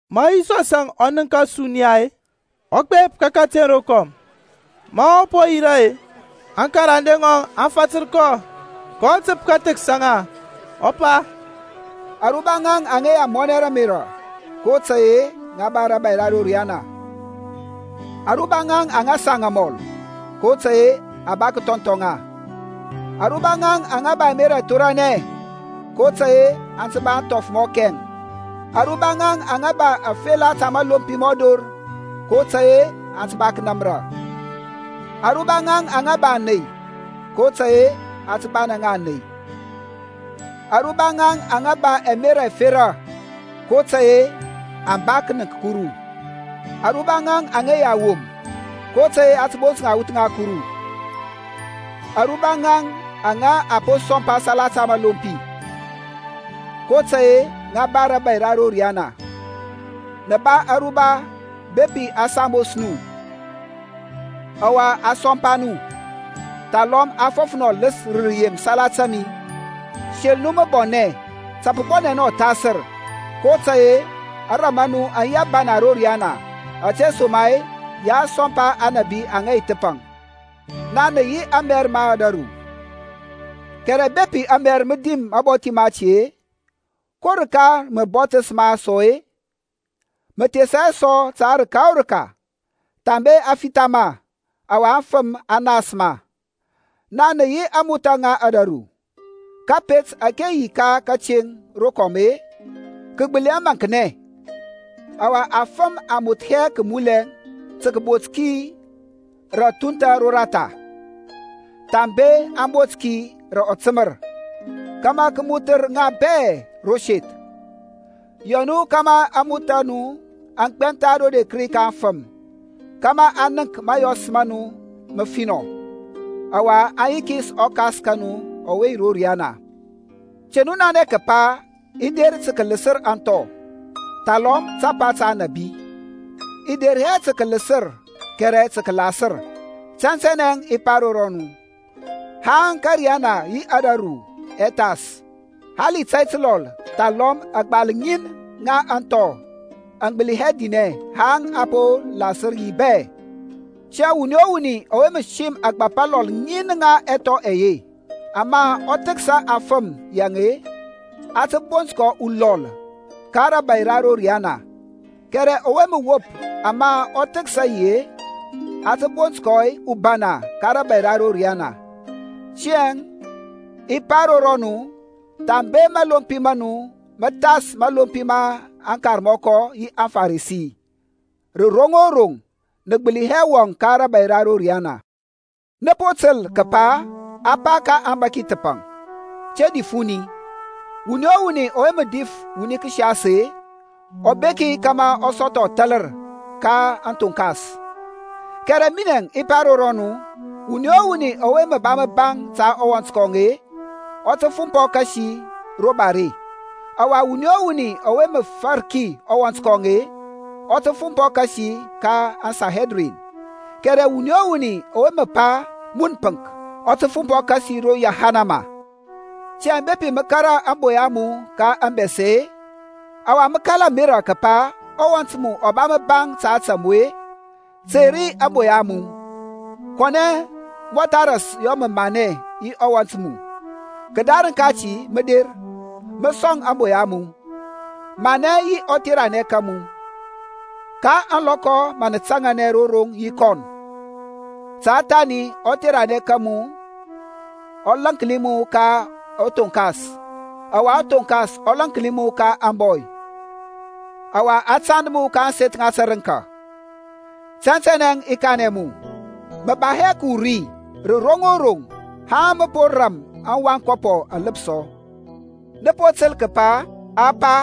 Ma Yisɔsȧŋ ɔ nənk ȧsuniya-e, ɔ gbep ka kǝteŋ rokɔm. Ma ɔ po yira-e, aŋkarande ŋɔŋ aŋ fatǝr kɔ. kɔ tǝp kǝthǝksa ŋa, ɔ pa, Aruba ŋaŋ aŋa yi amɔnɛ rǝ ȧmerȧ, kotȧy-e ŋa ba rȧbȧy ra ro riyana. Aruba ŋaŋ aŋa saŋ amɔl, kotȧy-e a ba kǝthɔnthɔ ŋa. Aruba ŋaŋ aŋa ba ɛmerȧ ɛthoranɛ, kotȧy-e aŋ tǝ ba ȧŋthɔf mɔ kɛŋ. Aruba ŋaŋ aŋa ba afela ta mȧlompi mɔ dor, kotȧy-e aŋ ba kǝnȧmrȧ. Aruba ŋaŋ aŋa ba ȧney, kotȧy-e a tǝ ba ŋa ȧney. Aruba ŋaŋ aŋa ba ɛmerȧ ɛfera, kotȧy-e aŋ ba kǝnǝŋk Kuru. Aruba ŋaŋ aŋa yi awom, kotȧy-e a tǝ bont ŋa aŋwuth ŋa Kuru. Aruba ŋaŋ aŋa a po sɔmpa salata mȧlompi, kotȧy-e ŋa ba rȧbȧy ra ro riyana. Nǝ ba aruba bepi a sambos nu, ɔwa a sɔmpa nu, thalɔm a fɔf nu ɔlǝs rǝ rǝyem salata mi. Sel nu mǝbɔnɛ, ta pǝ bɔnɛ nu ɔthasǝr, kotȧy-e ȧŋram a nu aŋ yi ȧbana ro riyana; ȧtesoma-e ya a sɔmpa aŋnabi aŋa yi thǝpaŋ. Naŋ nǝ yi amɛr ma ȧdȧru, kɛrɛ bepi amɛr mǝ dim mabɔthi mati-e, ko rǝka rǝ mǝ bɔthǝs ma sɔ-e? Mǝ thesa hɛ sɔ ta rǝka o rǝka thambe a fitha ma, ɔwa afǝm aŋ nas ma. Naŋ nǝ yi ȧŋmothȧ ŋa ȧdȧru. Kȧpet ȧke yi ka kǝteŋ rokɔm-e kǝ gbǝli hɛ maŋknɛ. Ɔwa afǝm aŋ moth hɛ kǝmulɛ tǝ kǝbot ki rǝ ȧthunthȧ roratha-e, thambe aŋ bot ki rǝ ɔtǝmǝr, kȧmȧ kǝ mothǝr ŋa bɛ ro seth. Yɔ nu kȧmȧ ȧŋmothȧ a nu aŋ gbɛntha rodi ka aŋfǝm, kȧmȧ aŋ nənk mȧyɔs ma nu mǝfinɔ, ɔwa aŋ yikis ɔKas ka nu ɔwe yi ro riyana. Te nu nanɛ kǝpa i der tǝ kǝlǝsǝr aŋthɔ, thalɔm tapa ta aŋnabi. I de hɛ tǝ kǝlǝsǝr, kɛrɛ tǝ kǝlasǝr. Tɛntɛnɛ i pa ro rɔnu, Haŋ ȧkȧriyana yi ȧdȧru ɛ thas-e, hali tȧy tǝlɔl thalɔm agbal ŋin ŋa aŋthɔ aŋ gbǝli hɛ dinɛ haŋ a po lasǝr ŋi bɛ. Tiyȧŋ wuni o wuni ɔwe mǝ sim ȧgbȧp alɔl ŋin ŋa ɛthɔ ɛye, ama ɔ thǝksa afǝm yaŋ-e, a tǝ bont kɔ ulɔl ka rȧbȧy ra ro riyana; kɛrɛ ɔwe mǝ wop ama ɔ thǝksa yi-e, a tǝ bont kɔ ubana ka rȧbȧy ra ro riyana. Tiyȧŋ i pa ro rɔnu, Thambe mȧlompi ma nu mǝ thas mȧlompi ma aŋkarmɔkɔ yi aŋFarisi-e, rǝ roŋ o roŋ nǝ gbǝli hɛ wɔŋ ka rȧbȧy ra ro riyana. Nǝ po tǝl kǝpa a pa ka aŋbȧki thǝpaŋ, Te dif wuni. Wuni o wuni ɔwe mǝ dif wuni kǝsias-e, ɔ beki kȧmȧ ɔ sɔthɔ ȧthȧlǝr ka aŋthonkas. Kɛrɛ minɛŋ i pa ro rɔnu, Wuni o wuni ɔwe ba mǝbaŋ ta ɔwɔnt kɔŋ-e, ɔ tǝ fumpɔ kasi ro bare; ɔwa wuni o wuni ɔwe mǝ farki ɔwɔnt kɔŋ-e, ɔ tǝ fumpɔ kasi ka aŋSanhedrin; kɛrɛ wuni o wuni ɔwe mǝ pa, Mun pǝŋk, ɔ tǝ fumpɔ kasi ro yahanama. Tiyȧŋ bepi mǝ kȧrȧ ȧŋboya a mu ka ȧŋbɛsɛ-e, ɔwa mǝ kala ȧmerȧ kǝpa ɔwɔnt mu ɔ ba mǝbaŋ ta ȧtȧ mu-e; tey ri ȧŋboya a mu, kɔnɛ mǝ mɔtha kȧl manɛ yi ɔwɔnt mu, kǝdarǝŋ kati mǝ der, mǝ sɔŋ ȧŋboya a mu. Manɛ yi ɔtheranɛ ka mu ka ȧŋlɔkɔ na mǝ taŋanɛ ro roŋ yi kɔn; ta thani ɔtheranɛ ka mu ɔ lȧnki mu ka ɔthoŋkas, ɔwa ɔthoŋkas ɔ lȧnki mu ka ȧŋbɔy, ɔwa a tand mu ka ȧŋseth ŋa tǝrǝŋka. Tɛntɛnɛ i kanɛ mu, mǝ ba hɛ kǝwur ri rǝ roŋ o roŋ haŋ mǝ poŋ ram aŋwankɔpɔ alǝpsɔ. Nǝ po tǝl kǝpa a pa,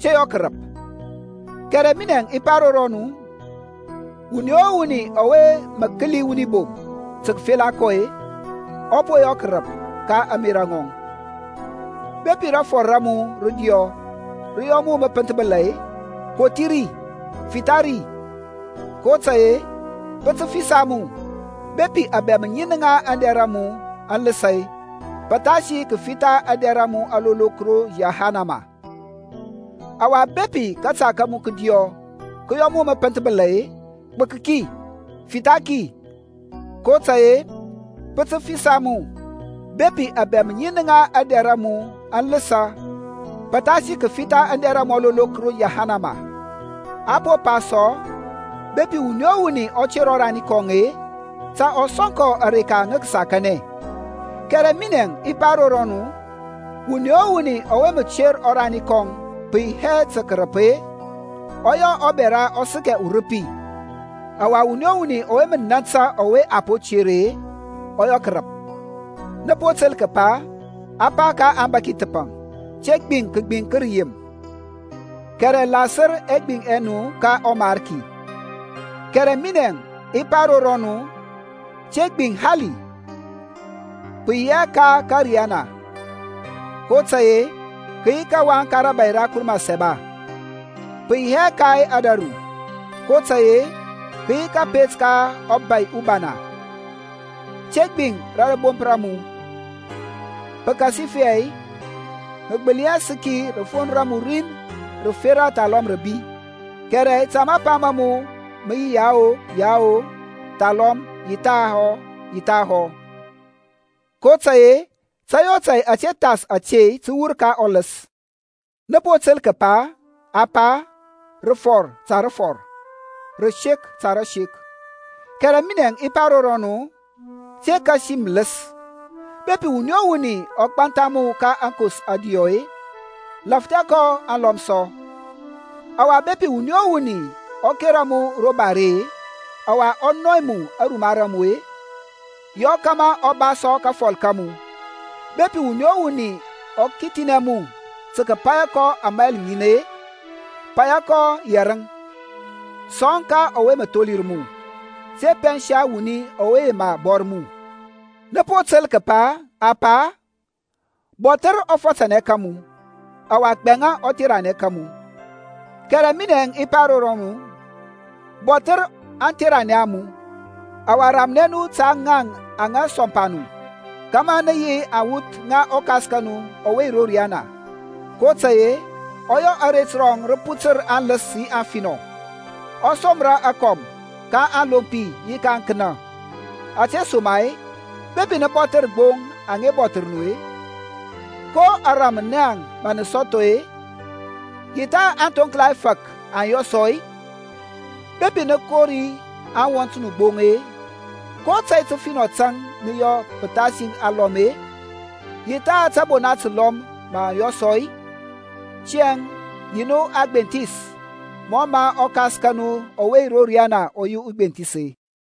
Te yɔ kǝrǝp. Kɛrɛ minɛȧŋ i pa ro rɔnu, Wuni o wuni ɔwe mǝ kǝli wuni bom tǝ kǝfela kɔ-e, ɔ po yɔ kǝrǝp ka ȧŋmerȧ ŋɔŋ. Bepi rafɔr ra mu rǝdiɔ rǝ yɔ mu mǝ pǝnthbǝla-e, kothi ri, fitha ri, kotȧy-e pǝ tǝ fisa mu bepi abɛm ŋin ŋa aŋdɛr a mu aŋ lǝsȧ-e, pǝthasi kǝfitha aŋdɛr a mu alolok ro yahanama. Ɔwa bepi kȧta ka mu kǝdiyɔ kǝ yɔ mu mǝ pǝnthbǝla-e, gbǝk ki, fitha ki, kotȧy-e pǝ tǝ fisa mu bepi abɛm ŋin ŋa aŋdɛr a mu aŋ lǝsǝ pǝthasi kǝfitha aŋdɛr a mu alolok ro yahanama. A po pa sɔ, Bepi wuni o wuni ɔ ter ɔrani kɔŋ-e, ta ɔ sɔŋ kɔ areka ŋa kasakanɛ; kɛrɛ minɛȧŋ i pa ro rɔnu, Wuni o wuni ɔwe mǝ ter ɔrani kɔŋ pǝ yi hɛ tȧ kǝrǝp-e, ɔ yɔ ɔbɛra ɔ sǝkɛ urǝpi, ɔwa wuni o wuni ɔwe mǝ nȧntȧ kɔ ɔwe a po ter-e, ɔ yɔ kǝrǝp. Nǝ po tǝl kǝpa a pa ka aŋbȧki thǝpaŋ, Te gbiŋ kǝgbiŋ ka rǝyem, kɛrɛ lasǝr ɛgbiŋ ɛ nu ka ɔMarki. Kɛrɛ minɛȧŋ i pa ro rɔnu, Te gbiŋ hali, pǝ yi hɛ ka ȧkȧriyana, kotȧy-e kǝ yi kawaŋ ka rȧbȧy ra Kuru Mǝsaba, pǝ yi hɛ ka ȧdȧru, kotȧy-e kǝ yi kȧpet ka ɔBȧy ubana. Te gbiŋ ka rȧbomp ra mu, pǝkasifɛ mǝ gbǝli hɛ sǝki rafon ra mu rin rǝfera thalɔm rǝbi. Kɛrɛ ta mapa ma mu mǝ yi Yao, Yao, thalɔm Yi thahɔ, Yi thahɔ; kotȧy-e tȧy o tȧy ȧte thas ȧte tǝ wur ka ɔlǝs. Nǝ po tǝl kǝpa a pa, Rǝfɔr ta rǝfɔr, rǝsek ta rǝsek; kɛrɛ minɛȧŋ i pa ro rɔnu, Te kasi mǝlǝs. Bepi wuni o wuni ɔ gbantha mu ka aŋkos ȧdiyɔ-e, lȧfthɛ kɔ aŋlɔm sɔ. Ɔwa bepi wuni o wuni ɔ kera mu ro bare-e, ɔwa ɔ nɔy mu aruma ra mu-e, yɔ kȧmȧ ɔ ba sɔ kafɔl ka mu. Bepi wuni o wuni ɔ kithinɛ mu tǝ kǝpȧyȧ kɔ ȧmayl ŋin-e, pȧyȧ kɔ yɛrǝŋ. Sɔŋ ka ɔwe mǝ tholir mu, te pɛnsa ɔwuni ɔwe yema bɔr mu. Nǝ po tǝl kǝpa a pa, Bɔthǝr ɔfatanɛ ka mu, ɔwa gbɛŋa ɔtheranɛ ka mu. Kɛrɛ minɛȧŋ i pa ro nu, Bɔthǝr aŋtheranɛ a nu, ɔwa ramnɛ nu ta ȧtȧ ŋaŋ aŋa sɔmpa nu, kȧmȧ nǝ yi aŋwuth ŋa ɔKas ka nu ɔwe yi ro riyana. Kotȧy-e ɔ yɔ aret rɔŋ rǝ putǝr ka aŋlǝs yi ka aŋfinɔ, ɔ somra akɔm ka aŋlompi yi ka aŋkǝnȧ. Ȧtesoma-e bepi nǝ bɔthǝr gbo aŋa bɔthǝr nu-e, ko ȧrȧm naŋ mǝ nǝ sɔthɔ-e? Yaŋ tha aŋthoŋkla ɛfȧk aŋ yɔ sɔ-e? Bepi nǝ kori aŋwɔnt nu gbo-e, ko tȧy tǝfinɔ tȧŋ nǝ yɔ pǝthas alɔm-e? Yaŋ tha tȧbona tǝlɔm mǝ aŋ yɔ sɔ-e? Tiyȧŋ yi nu agbenthis mɔ mǝ ɔKas ka nu ɔwe yi ro riyana ɔ yi ugbenthis.